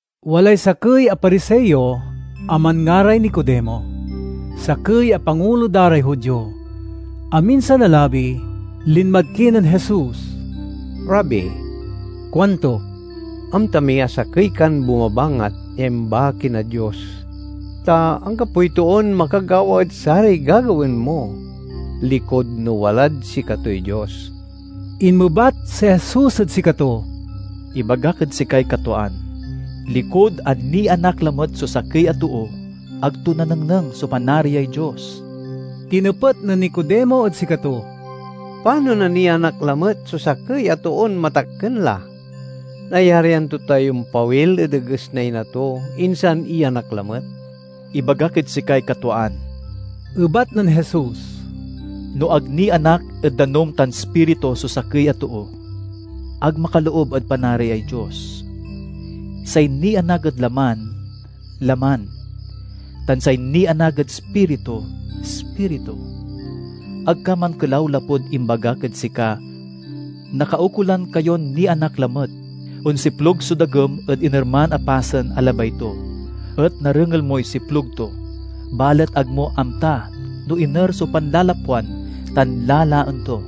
Walay sakey a Pariseo a manngaray Nicodemo, sakey a pangulo da ray Judio. Aminsan a labi, linmad kinen Jesus. "Rabi," kuanto, "amta mi a sakey kan bumabangat ya imbaki na Dios. Ta anggapoy toon makagawa ed saray gagawaen mo, likud no walad sikatoy Dios." Inmebat si Jesus ed sikato, "Ibagak ed sikay katwaan: likud a nianak lamet so sakey a too, ag to nanengneng so Panariay Dios." Tinepet nen Nicodemo ed sikato, "Panon a nianak lamet so sakey a toon matakken la? Nayarian to tay ompawil ed eges na ina to insan iyanak lamet?" "Ibagak ed sikay katwaan," ebat nen Jesus, "no ag nianak ed danum tan Ispiritu so sakey a too, ag makaloob ed Panariay Dios. Say nianak ed laman, laman, tan say nianak ed Ispiritu, ispiritu. Ag ka mankelaw lapud imbagak ed sika, 'Nakaukolan kayon nianak lamet. Onsiplug so dagem ed inerman a pasen a labay to, et narengel moy siplug to, balet ag mo amta no iner so panlalapwan tan lalaen to.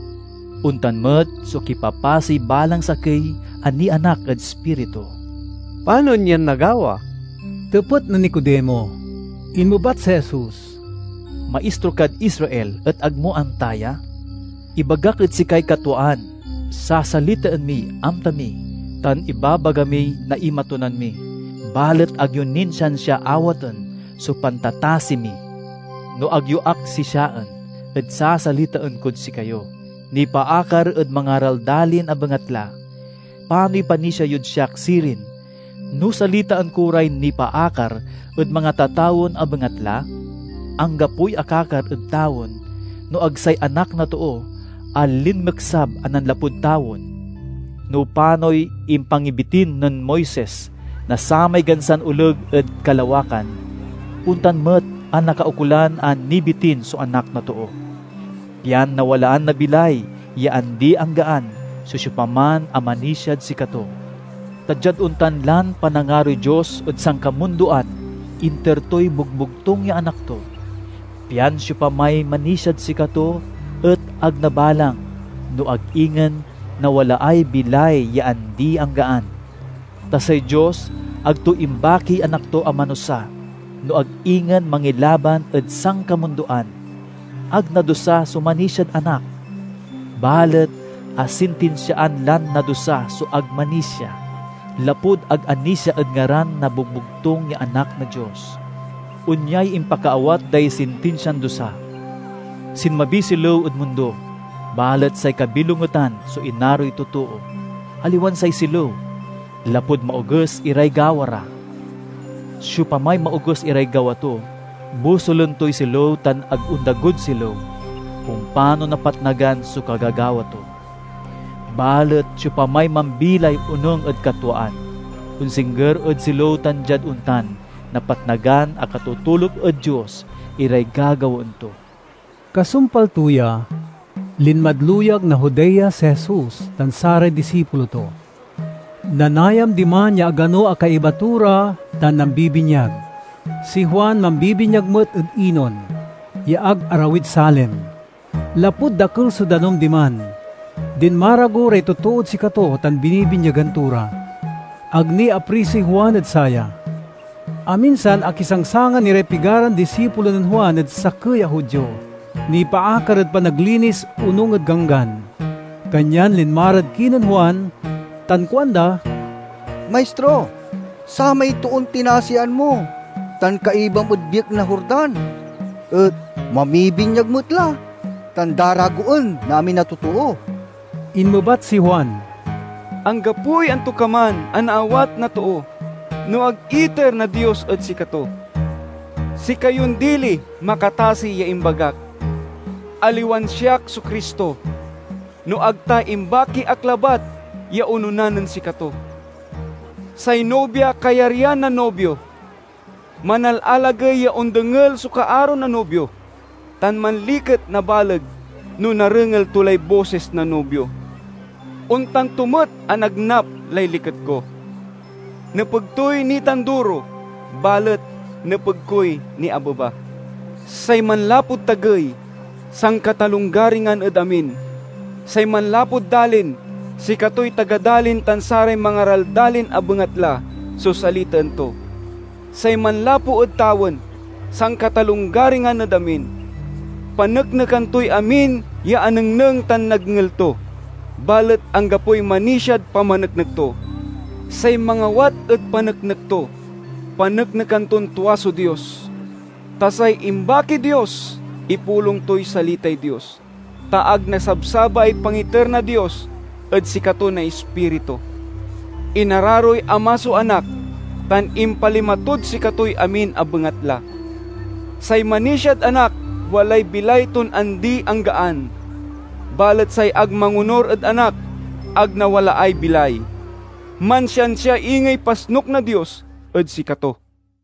Ontan met so kipapasey balang sakey a nianak ed Ispiritu." "Panon yan nagawa?" tepet nen Nicodemo. Inmebat si Jesus, "Maistro kad Israel et ag mo amta ya? Ibagak ed sikay katwaan: sasalitaen miy amta mi, tan ibabaga miy naimatonan mi, balet ag yo nin siansia awaten so pantatasi mi. No ag yo ak sisiaen ed sasalitaen kod sikayo nipaakar ed mangaraldalin a bengatla, panoy panisia yod siak sirin no salitaen ko ray nipaakar ed mangatatawen a bengatla? Anggapoy akakar ed tawen no ag say Anak na Too a linmeksab a nanlapud tawen." No panoy impangibitin nen Moises na samay gansan oleg ed kalawakan, ontan met a nakaukolan a nibitin so Anak na Too, pian nawalaan na bilay ya andi-anggaan so siopaman a manisiad sikato. Ta diad ontan lan panangaroy Dios ed sankamundoan inter toy bogbogtung ya Anak to, pian siopamay manisiad sikato et ag nabalang no ag ingen nawalaay bilay ya andi-anggaan. Ta say Dios ag to imbakiy Anak to a manusa, no ag ingen mangilaban, ed sankamundoan. Ag nadusa so manisiad Anak, balet asintinsiaan lan nadusa so ag manisia, lapud ag anisia ed ngaran na bogbogtung ya Anak na Dios. Onyay impakaawat day sintinsian dusa: sinmabiy silew ed mundo, balet say kabilongetan so inaroy totoo, aliwan say silew, lapud maoges iray gawa ra. Siopamay maoges iray gawa to bosulen toy silew tan ag ondagod silew, ompano napatnagan so kagagawa to. Balet siopamay mambilay onung ed katwaan, onsingger ed silew tan diad ontan napatnagan a katotoluk ed Dios iray gagawaen to. Kasumpal to ya, linmad luyag na Judea si Jesus tan saray disipulo to. Nanayam diman ya agano a kaiba to ra, tan nambibinyag. Si Juan mambibinyag met ed Enon, ya ag arawid Salim, lapud dakel so danum diman. Dinmarago ray totood sikato tan binibinyagan to ra. (Ag ni aprisoy Juan ed saya). Aminsan akisangsangan iray pigaran disipulo nen Juan ed sakey a Judio, nipaakar ed panaglinis onung ed ganggan. Kanyan linma rad kinen Juan tan kuanda, "Maistro, samay toon tinasian mo tan kaibam ed biek na Jordan et mamibinyag met la tan daragoen na amin a totoo." Inmebat si Juan, "Anggapoy antokaman a naawat na too, no ag iter na Dios ed sikato. Sikayon diliy makatasi ya imbagak, 'Aliwan siak so Cristo, no ag ta imbaki ak labat ya onona nen sikato.' Say nubia kayaryan na nubio. Manalalagey ya ondengel so kaaro na nubio, tan manliket na baleg no narengel to lay bosis na nubio. Ontan to met a nagnap lay liket ko. Nepeg toy nitanduro, balet nepeg koy niabeba." Say manlapud tagey, sankatalonggaringan ed amin. Say manlapud dalin, sikatoy taga dalin tan saray mangaraldalin a bengatla so salitaen to. Say manlapu ed tawen, sankatalonggaringan ed amin. Paneknekan toy amin ya anengneng tan nadngel to, balet anggapoy manisiad pamaneknek to. Say mangawat ed paneknek to paneknekan ton tua so Dios. Ta say imbakiy Dios ipulong toy salitay Dios, ta ag nasabsabaay pangiter na Dios ed sikato na Ispiritu. Inararoy Ama so Anak tan impalima tod sikatoy amin a bengatla. Say manisiad Anak walay bilay ton andi-anggaan, balet say ag mangonur ed Anak ag nawalaay bilay—mansiansia ingey pasnuk na Dios ed sikato.